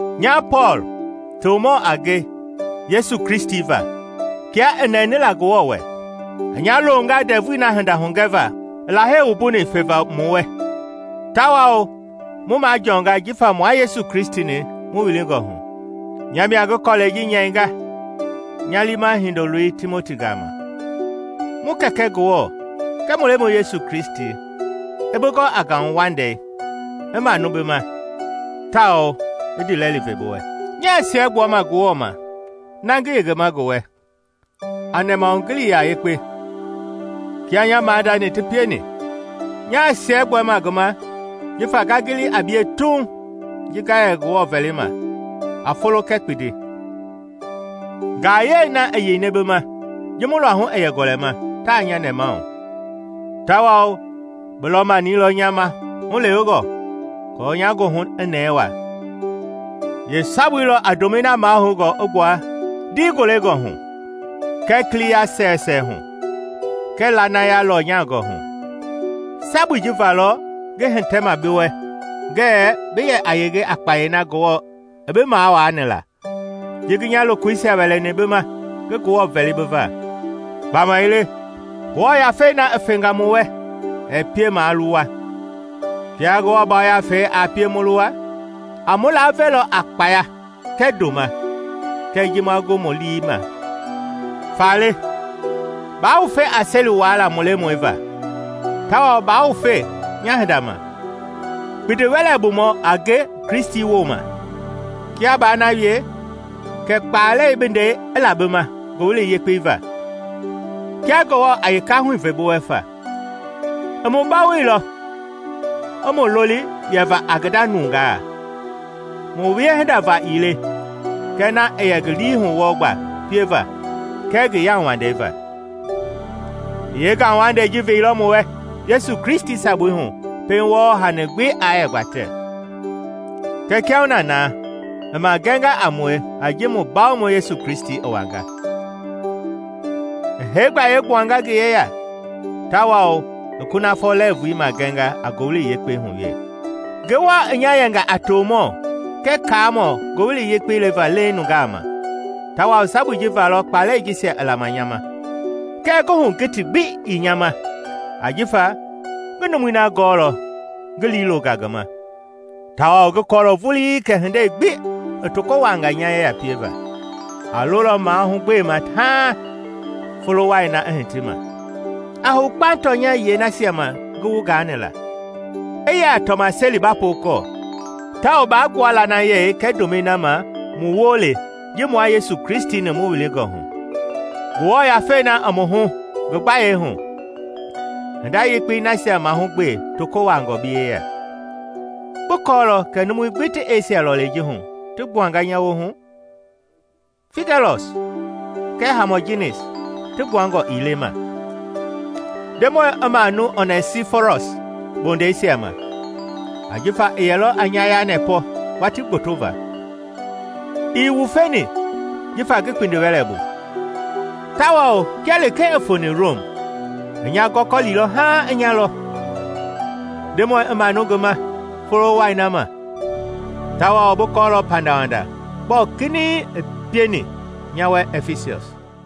Nya Pɔɔl, tomɔ a nge Yesu Kristi va kia i nɛni la Ngewɔ wɛ, i nya longa ndɛvui na hinda hugɛva i Lahei wumbuni feva mu wɛ, tawao mu majɔɔnga jifa mua Yesu Kristi-ni mu wilingɔ hu. Nya mia ngi kɔlɛi ji nyɛinga nya liima hindoloi Timoti gama. Mu Kɛkɛ Ngewɔ kɛɛ mu Lemɔi Yesu Kristi i bi gɔ a ngauwandei, i manu bi ma, tawao i ndiilɛli ve bi wɛ. Nyaa siɛgbuama Ngewɔ ma na ngi yengema ngi wɛ a nɛmahugiliya yekpe, kia nya maadani ti pieni. Nyaa siɛgbuama ngi ma jifa nga gili a bie tuuŋ ji nga yɛ Ngewɔ vɛlima a folo kɛɛ kpindi. Ngayɛi na i yeini bi ma ji mu luahu i yɛ gɔlɛma taa nya nɛmahu, tawao bi lɔmani lɔ nya ma hulewengɔ aako nya goohu i nɛɛ waa. Yee sabui lɔ a ndomɛi na mahoungɔ i gbua ndiigolengɔ hu, kɛɛ kiliya sɛwɛsɛwɛ hu, kɛɛ lanaya lɔnyangɔ hu. Sabui ji va lɔ ngi hitɛma bi wɛ ngɛɛ bi yɛ a yenge a kpayei na Ngewɔ i bi mawaani la ji ngi nya lokoisia wɛlɛni bi ma ngi Ngewɔ vɛli bi va. Gbamaile Ngewɔ Yafei na i fenga mu wɛ ɛɛ pie maa luwa; kia Ngewɔ Yafei aa pie mu luwa, a mu laavelɔ a kpaya kɛɛ ndoma kɛɛ ji ma gu mu lii ma. Faale, baa wufe a seli wuaala mu Lemɔi va; tawao baa wufe nya hinda ma, kpindi-wɛlɛbumɔ a nge Kristi wooma. Kia baa na wie, kɛ kpalɛi bi ndɛi i la bi ma Ngowili Yekpei va, kia Ngewɔ a yeekahui ve bi wɛ fa. I mu bawoilɔ i mu loli yɛva a ngi nda nungaa, mu wiehinda va ii le, kɛ na i yɛ ngi liihu wɔɔ gba pieva kɛɛ ngi yauwandei va. I yeengauwandei ji veilɔ mu wɛ Yesu Kristi sabui hu pɛiŋ wɔɔ hani gbi i yaa gbatɛ, kɛɛ kiahuna na i magɛnga a mue a ji mu Bawomɔi Yesu Kristi i wanga. I hee gbayei gbuanga ngi yeya tawao i kunafɔ lɛɛvui magɛnga a Ngowili Yekpei hu wee. Ngewɔ i nya yɛnga a tomɔ kɛɛ kaamɔ Ngowili Yekpei leva leiŋ nungaa ma, tawao sabui ji valɔ kpalɛi jisia ti lama nya ma. Kɛɛ nguhugiti gbi ii nya ma ajifa ngi numui na gɔɔlɔ ngi lii longa ngi ma, tawao ngi kɔɔlɔ vulii kɛ hindei gbi i toko wuaanga nya yeya pieva, a lolɔ mahugbema haaŋ folo wai na i hiti ma. A hou kpaŋ tɔnya yiɛi nasia ma ngi wu gaani la, i yɛ a tɔmaseli ba pookɔɔ, tawao baa gbua lanayei kɛɛ ndomɛi na ma mu woo le ji mua Yesu Kristi-ni mu wilingɔ hu. Ngewɔ Yafei na i mu hu ngi gbayei hu, hinda yekpei nasia mahugbe toko wuaangɔ bi yeya. Bi kɔɔlɔ kɛ numui gbi ti Esia lɔlei ji hu ti gbuanga nya woohu, Figɛlɔs kɛɛ Hamɔginis ti gbuangɔ ii le ma. Ndemɔi i manu Onɛsiforɔs bondɛisia ma, ajifa i yɛlɔ a nya yanɛpɔ watii gboto va. Ii wufeni jifa ngi kpindi-wɛlɛ bu, tawao kia lekee i foni Rom, i a nya gɔkɔlilɔ haaŋ i nya lɔ. Ndemɔi i manu ngi ma Folo wai na ma! Tawao bi kɔɔlɔ pandawanda gbɔɔ kinɛiŋ i pieni nya wɛ Ɛfisɔs.